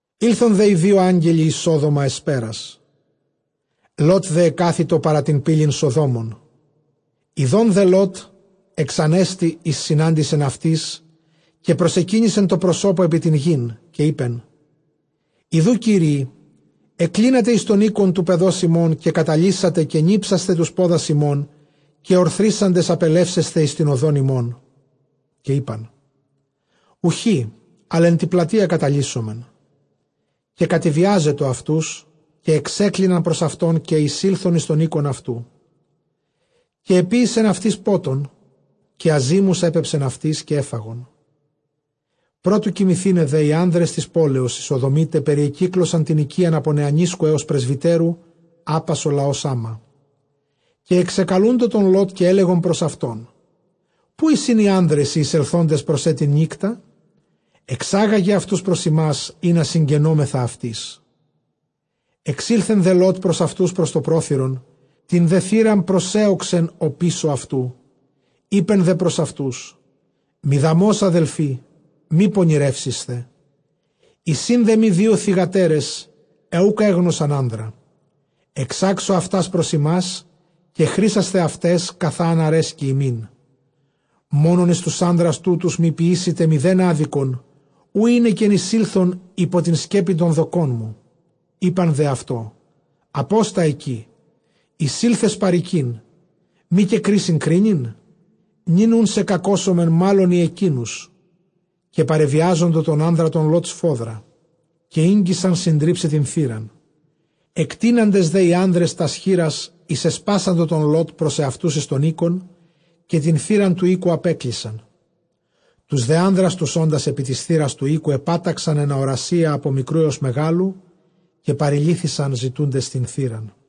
Ἦλθον δε οἱ δύο ἄγγελοι εἰς Σόδομα ἑσπέρας. Λὼτ δὲ ἐκάθητο παρὰ τὴν πύλην Σοδόμων· ἰδὸν δὲ Λὼτ, ἐξανέστη εἰς συνάντησιν αὐτοῖς, καὶ προσεκύνησε τῷ προσώπῳ ἐπὶ τὴν γῆν. Καὶ εἶπεν, ἰδοὺ, Κύριοι, ἐκκλίνατε εἰς τὸν οἶκον τοῦ παιδὸς ὑμῶν, καὶ καταλύσατε, καὶ νίψασθε τοὺς πόδας ὑμῶν, καὶ ὀρθρίσαντες ἀπελεύσεσθε εἰς τὴν ὁδὸν ὑμῶν. Καὶ εἶπαν, οὐχὶ, ἀλλʼ ἐν τῇ πλατείᾳ καταλύσομεν. Καὶ κατεβιάσατο αὐτοὺς, καὶ ἐξέκλιναν πρὸς αὐτὸν, καὶ εἰσῆλθον εἰς τὸν οἶκον αὐτοῦ· καὶ ἐποίησεν αὐτοῖς πότον, καὶ ἀζύμους ἔπεψεν αὐτοῖς, καὶ ἔφαγον. Πρὸ τοῦ κοιμηθῆναι δὲ, οἱ ἄνδρες τῆς πόλεως, οἱ Σοδομῖται περιεκύκλωσαν τὴν οἰκίαν, ἀπὸ νεανίσκου ἕως πρεσβυτέρου, ἅπας ὁ λαὸς ἅμα. Καὶ ἐξεκαλοῦντο τὸν Λὼτ, καὶ ἔλεγον πρὸς αὐτὸν, ποῦ εἰσιν οἱ ἄνδρες οἱ εἰσελθόντες πρὸς σὲ τὴν νύκτα; ἐξάγαγε αὐτοὺς πρὸς ἡμᾶς, ἵνα συγγενώμεθα αὐτοῖς. Ἐξῆλθε δὲ Λὼτ πρὸς αὐτοὺς πρὸς τὸ πρόθυρον, τὴν δὲ θύραν προσέῳξεν ὀπίσω αὐτοῦ. Εἶπε δὲ πρὸς αὐτοὺς, μηδαμῶς ἀδελφοὶ μὴ πονηρεύσησθε. Εἰσὶ δέ μοι δύο θυγατέρες, αἳ οὐκ ἔγνωσαν ἄνδρα· ἐξάξω αὐτὰς πρὸς ὑμᾶς, καὶ χρᾶσθε αὐταῖς καθὰ ἂν ἀρέσκοι ὑμῖν· μόνον εἰς τοὺς ἄνδρας τούτους μὴ ποιήσητε ἄδικον, οὗ εἵνεκεν εἰσῆλθον ὑπὸ τὴν σκέπην τῶν δοκῶν μου. Εἶπαν δὲ αὐτῷ, ἀπόστα ἐκεῖ· εἰσῆλθες παροικεῖν, μὴ καὶ κρίσιν κρίνειν; νῦν οὖν σε κακώσωμεν μᾶλλον ἢ ἐκείνους. Καὶ παρεβιάζοντο τὸν ἄνδρα τὸν Λὼτ σφόδρα, καὶ ἤγγισαν συντρίψαι τὴν θύραν. Ἐκτείναντες δὲ οἱ ἄνδρες τὰς χεῖρας εἰσεσπάσαντο τὸν Λὼτ πρὸς ἑαυτοὺς εἰς τὸν οἶκον, καὶ τὴν θύραν τοῦ οἴκου ἀπέκλεισαν. Τοὺς δὲ ἄνδρας τοὺς ὄντας ἐπὶ τῆς θύρας τοῦ οἴκου ἐπάταξαν ἐν ἀορασίᾳ ἀπὸ μικροῦ ἕως μεγάλου· καὶ παρελύθησαν ζητοῦντες τὴν θύραν.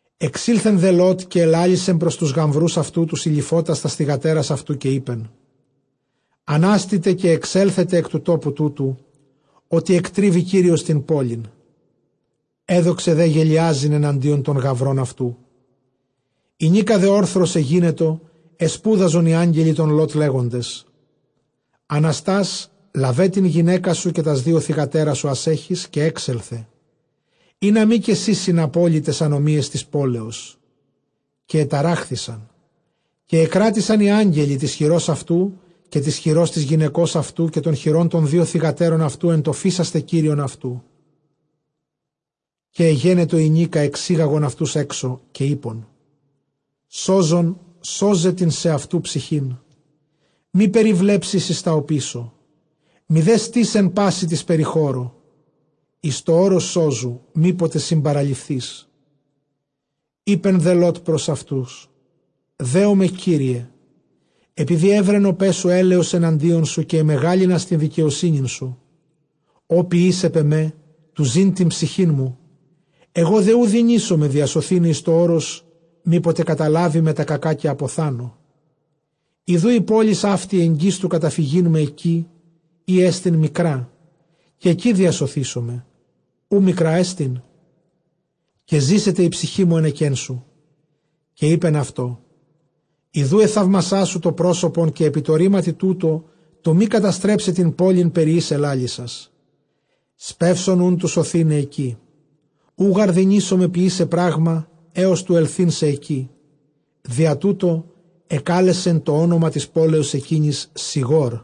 Ἐξῆλθε δὲ Λῶτ, καὶ ἐλάλησε πρὸς τοὺς γαμβροὺς αὐτοῦ τοὺς εἰληφότας τὰς θυγατέρας αὐτοῦ, καὶ εἶπεν, ἀνάστητε, καὶ ἐξέλθετε ἐκ τοῦ τόπου τούτου, ὅτι ἐκτρίβει Κύριος τὴν πόλιν· ἔδοξε δὲ γελοιάζειν ἐναντίον τῶν γαμβρῶν αὐτοῦ. Ἡνίκα δὲ ὄρθρος ἐγένετο, ἐσπούδαζον οἱ ἄγγελοι τὸν Λὼτ, λέγοντες, ἀναστὰς λάβε τὴν γυναῖκά σου, καὶ τὰς δύο θυγατέρας σου, ἃς ἔχεις, καὶ ἔξελθε, ἵνα μὴ καὶ σὺ συναπόλῃ ταῖς ἀνομίαις τῆς πόλεως. Καὶ ἐταράχθησαν, καὶ ἐκράτησαν οἱ ἄγγελοι τῆς χειρὸς αὐτοῦ, καὶ τῆς χειρὸς τῆς γυναικὸς αὐτοῦ, καὶ τῶν χειρῶν τῶν δύο θυγατέρων αὐτοῦ, ἐν τῷ φείσασθαι Κύριον αὐτοῦ. Καὶ ἐγένετο ἡνίκα ἐξήγαγον αὐτοὺς ἔξω, καὶ εἶπαν, σώζων σῶζε τὴν σεαυτοῦ ψυχήν· μὴ περιβλέψῃ εἰς τὰ ὀπίσω, μηδὲ στῇς ἐν πάσῃ τῇ περιχώρῳ· εἰς τὸ ὄρος σώζου, μή ποτε συμπαραληφθῇς. Εἶπε δὲ Λὼτ πρὸς αὐτοὺς, δέομαι Κύριε, ἐπειδὴ εὗρεν ὁ παῖς σου ἔλεος ἐναντίον σου, καὶ ἐμεγάλυνας τὴν δικαιοσύνην σου, ὃ ποιεῖς ἐπʼ ἐμὲ, τοῦ ζῆν τὴν ψυχήν μου· ἐγὼ δὲ οὐ δυνήσομαι διασωθῆναι εἰς τὸ ὄρος, μή ποτε καταλάβῃ με τὰ κακὰ, καὶ ἀποθάνω. Ἰδοὺ πόλις αὕτη ἐγγὺς τοῦ καταφυγεῖν με ἐκεῖ, ἥ ἐστι μικρά· καὶ ἐκεῖ διασωθήσομαι· οὐ μικρά ἐστι; καὶ ζήσεται ἡ ψυχή μου ἕνεκέν σου. Καὶ εἶπεν αὐτῷ, ἰδοὺ ἐθαύμασά σου τὸ πρόσωπον καὶ ἐπὶ τῷ ῥήματι τούτῳ, τοῦ μὴ καταστρέψαι τὴν πόλιν περὶ ἧς ἐλάλησας. Σπεῦσον οὖν τοῦ σωθῆναι ἐκεῖ, οὐ γὰρ δυνήσομαι ποιῆσαι πρᾶγμα, ἕως τοῦ ἐλθεῖν σε ἐκεῖ. διὰ τοῦτο ἐκάλεσε τὸ ὄνομα τῆς πόλεως ἐκείνης, Σηγώρ.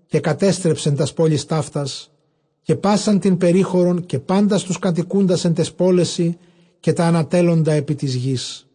Καὶ κατέστρεψε τὰς πόλεις ταύτας, καὶ πᾶσαν τὴν περίχωρον, καὶ πάντας τοὺς κατοικοῦντας ἐν ταῖς πόλεσι, καὶ τὰ ἀνατέλλοντα ἐκ τῆς γῆς.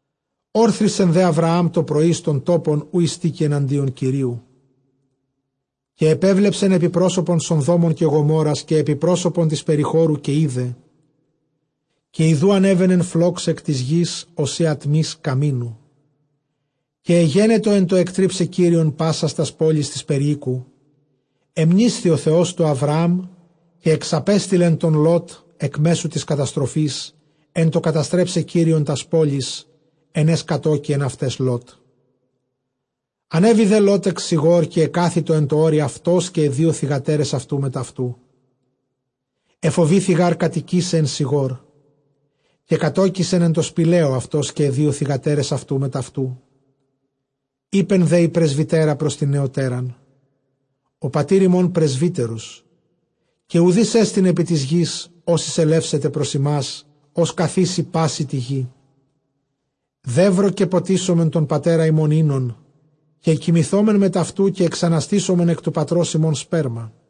Ὤρθρισε δὲ Ἁβραὰμ τῷ πρωῒ εἰς τὸν τόπον, οὗ εἱστήκει ἐναντίον Κυρίου. Καὶ ἐπέβλεψεν ἐπὶ πρόσωπον Σοδόμων καὶ Γομόῤῥας, καὶ ἐπὶ πρόσωπον τῆς περιχώρου, καὶ εἶδε, καὶ ἰδοὺ ἀνέβαινεν φλὸξ ἐκ τῆς γῆς, ὡσεὶ ἀτμὶς καμίνου. Καὶ ἐγένετο ἐν τῷ ἐκτρίψαι τὸν Θεὸν πάσας τὰς πόλεις τῆς περιοίκου, ἐμνήσθη ὁ Θεὸς τοῦ Ἁβραάμ· καὶ ἐξαπέστειλε τὸν Λὼτ ἐκ μέσου τῆς καταστροφῆς, ἐν τῷ καταστρέψαι Κύριον τὰς πόλεις, ἐν αἷς κατῴκει ἐν αὐταῖς Λώτ. Ἀνέβη δὲ Λὼτ ἐκ Σηγὼρ, καὶ ἐκάθητο ἐν τῷ ὄρει αὐτὸς, καὶ αἱ δύο θυγατέρες αὐτοῦ μετʼ αὐτοῦ· ἐφοβήθη γὰρ κατοικῆσαι ἐν Σηγώρ· καὶ κατῴκησεν ἐν τῷ σπηλαίῳ αὐτὸς, καὶ αἱ δύο θυγατέρες αὐτοῦ μετʼ αὐτοῦ. Εἶπε δὲ ἡ πρεσβυτέρα πρὸς τὴν νεωτέραν, ὁ πατὴρ ἡμῶν πρεσβύτερος, καὶ οὐδείς ἐστιν ἐπὶ τῆς γῆς, ὃς εἰσελεύσεται πρὸς ἡμᾶς, ὡς καθήκει πάσῃ τῇ γῇ. Δεῦρο καὶ ποτίσωμεν τὸν πατέρα ἡμῶν οἶνον, καὶ κοιμηθῶμεν μετʼ αὐτοῦ, καὶ ἐξαναστήσωμεν ἐκ τοῦ πατρὸς ἡμῶν σπέρμα.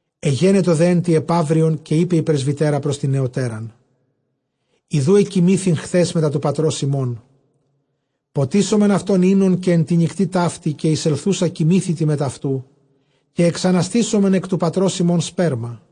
Ἐγένετο δὲ ἐν τῇ ἐπαύριον, καὶ εἶπεν ἡ πρεσβυτέρα πρὸς τὴν νεωτέραν, ἰδοὺ ἐκοιμήθην χθὲς μετὰ τοῦ πατρὸς ἡμῶν· ποτίσωμεν αὐτὸν οἶνον καὶ ἐν τῇ νυκτὶ ταύτῃ, καὶ εἰσελθοῦσα κοιμήθητι μετʼ αὐτοῦ, καὶ ἐξαναστήσωμεν ἐκ τοῦ πατρὸς ἡμῶν σπέρμα.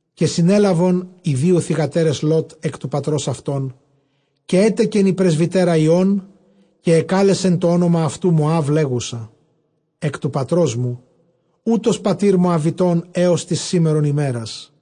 Καὶ συνέλαβον αἱ δύο θυγατέρες Λὼτ ἐκ τοῦ πατρὸς αὐτῶν. Καὶ ἔτεκεν ἡ πρεσβυτέρα υἱὸν, καὶ ἐκάλεσε τὸ ὄνομα αὐτοῦ Μωὰβ, λέγουσα, ἐκ τοῦ πατρός μου· οὗτος πατὴρ Μωαβιτῶν ἕως τῆς σήμερον ἡμέρας.